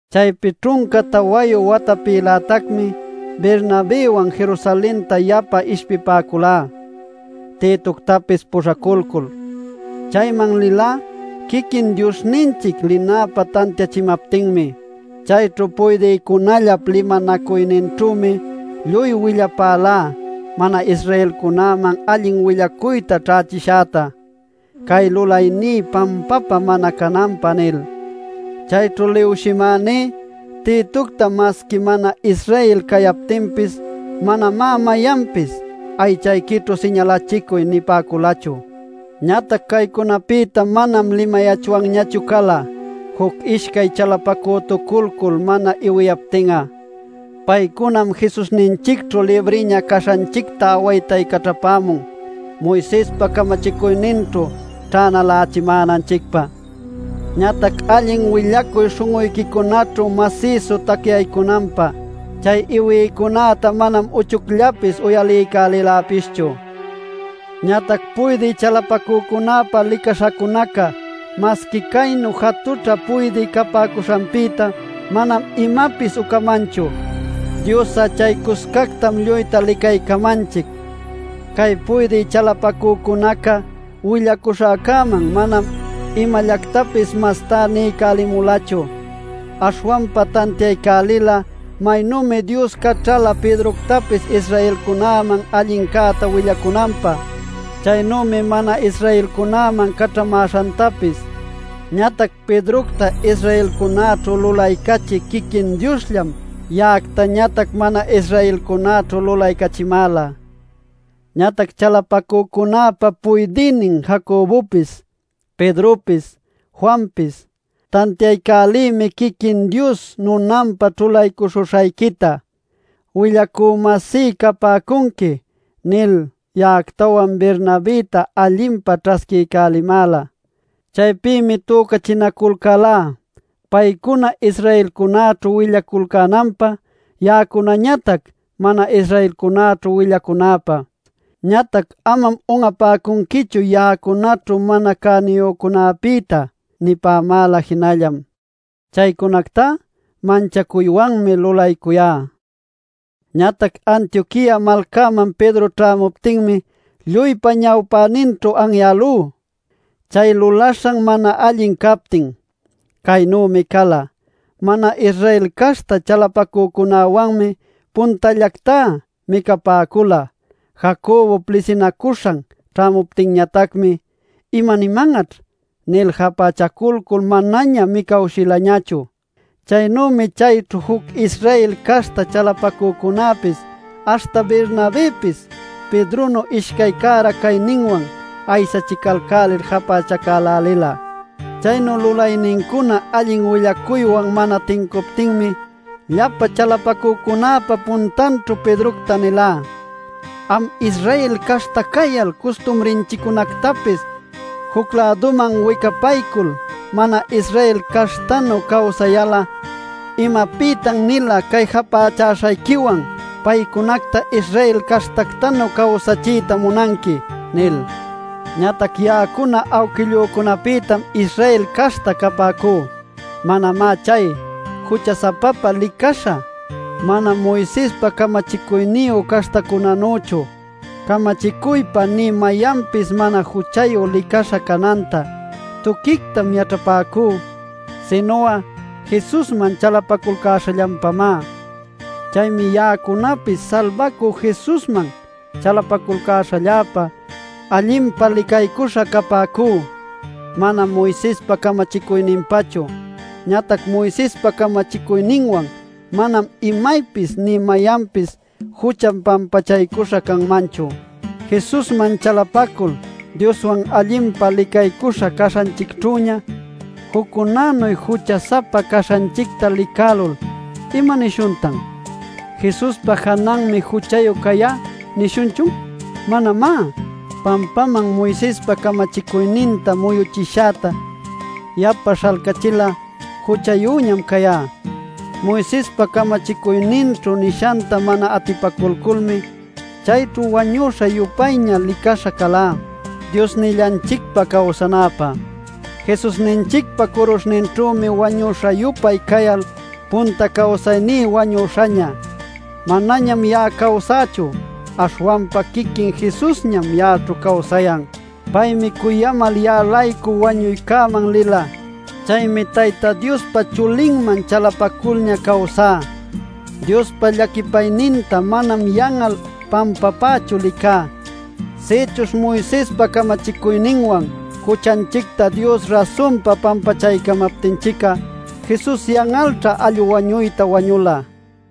Chaypi ćhunca tawayu watapïlätacmi Bernabëwan Jerusalenta yapa ishpipäculá Titoctapis puśhaculcul. Chayman lilá quiquin Diosninchic linäpä tantiachimaptinmi. Chayćhu puydïcunallap limanacuyninćhümi lluy willapälá mana-Israelcunäman allin willacuyta ćhaycachishäta “cay lulayní pampapä mana cananpä” nil. Chayćhu liwshimäní Titocta masqui mana-Israel cayaptinpis, manamá mayanpis “aychayquićhu siñalachicuy” nipäculachu. Ñatac caycunapïta manam limayachwanñachu cala, juc ishcay chalapacütuculcul mana iwiyaptin'a. Paycunam Jesusninchicćhu libriña caśhanchicta awaytaycaćhapämun Moisespa camachicuyninćhu ćhänalächimänanchicpä. Ñatac allin willacuy śhun'uyquicunaćhu masïsu tacyaycunanpä, chay iwïcunäta manam uchucllapis uyaliycäliläpischu. Ñatac puydï chalapacücunäpa licaśhacunaca - masqui caynu jatućhä puydï capäcuśhanpïta manam imapis ucamanchu; Dios'a chay cuscactam lluyta licaycamanchic - cay puydï chalapacücunaca willacuśhäcäman manam imallactapis mastá niycälimulachu. Aśhwanpa tantiaycälila maynümi Dios caćhala Pedroctapis Israelcunäman allincäta willaycunanpä, chaynümi mana-Israelcunäman caćhamäśhantapis. Ñatac Pedrocta Israelcunäćhu lulaycachï quiquin Diosllam ya'actañatac mana-Israelcunäćhu lulaycachimäla. Ñatac chalapacücunäpa puydïnin Jacobopis, Pedropis, Juanpis “Tantiaycälïmi quiquin Dios nunanpä ćhulaycuśhuśhayquita. Willacü-masí capäcunqui” nil ya'actawan Bernabëta allinpa ćhasquiycälimäla. Chaypïmi tücachinaculcälá paycuna Israelcunäćhu willaculcänanpä, ya'acunañatac mana-Israelcunäćhu willacunäpä. Ñatac “amam un'apäcunquichu ya'acunaćhu mana cäniyücunapïta” nipämäla jinallam. Chaycunactá manchacuywanmi lulaycuyá. Ñatac Antioquia malcaman Pedro ćhämuptinmi lluypa ñawpäninćhu anyälú, chay lulaśhan mana allin captin. Caynümi cala: mana-Israel caśhta chalapacücunäwanmi puntallactá micapäcula. Jacobop lisinaculcäśhan ćhämuptinñatacmi “imaniman'aćh” nil japächaculcul manaña micawshilañachu. Chaynümi chayćhu juc Israel caśhta chalapacücunäpis aśhta Bernabëpis, Pedronu ishcay cära cayninwan aysachicälälil japächacälälila. Chaynu lulaynincuna allin willacuywan mana tincuptinmi, llapa chalapacücunäpa puntanćhu Pedrocta nilá: “Am Israel caśhta cayal custumrinchiccunactapis juc-läduman wicapaycul mana-Israel caśhtanu cawsayal'a, ¿imapïtan-nila cay japächäśhayquiwan paycunacta Israel caśhtactanuy cawsachiyta munanqui?” nil. Ñatac ya'acuna awquillücunapïtam Israel caśhta capäcú; manamá chay “jucha-sapapa licaśha” mana Moisespa camachicuyniyu caśhtacunänüchu. Camachicuypa nï mayanpis mana juchayu licaśha cananta, tuquictam yaćhapäcú, sinu'a Jesusman chalapaculcäśhallanpamá. Chaymi ya'acunapis Salbacü Jesusman chalapaculcäśhalläpa allinpa licaycuśha capäcú, manam Moisespa camachicuyninpachu. Ñatac Moisespa camachicuyninwan manam imaypis nï mayanpapis juchan pampachaycuśha canmanchu. Jesusman chalapacul Dioswan allinpa licaycuśha caśhanchicćhüña juccunanu jucha-sapa caśhanchicta licälul ¿imanishuntan? ¿“Jesuspa jananmi juchayu cayá” nishunchun? ¡Manamá! Pampaman Moisespa camachicuyninta muyuchishäta yapa śhalcachil'a, juchayüñam cayá. Moisespa camachicuyninćhu nishanta mana atipaculculmi chayćhu wañuśha-yupayña licaśha calá, Diosnillanchicpa cawsanäpä. Jesusninchicpa curuśhninćhümi wañuśha-yupay cayal punta cawsayní wañuśhaña. Manañam ya'a cawsächu; aśhwanpa quiquin Jesusñam ya'aćhu cawsayan. Paymi cuyamal ya'a-laycu wañuycäman lila. Chaymi Tayta Diospa Chulinman chalapaculña cawsá. Diospa llaquipayninta manam yan'al pampapächu licá. Sïchuśh Moisespa camachicuyninwan juchanchicta Dios rasunpa pampachamaptinchic'a Jesus yan'alćha allu wañuyta wañula.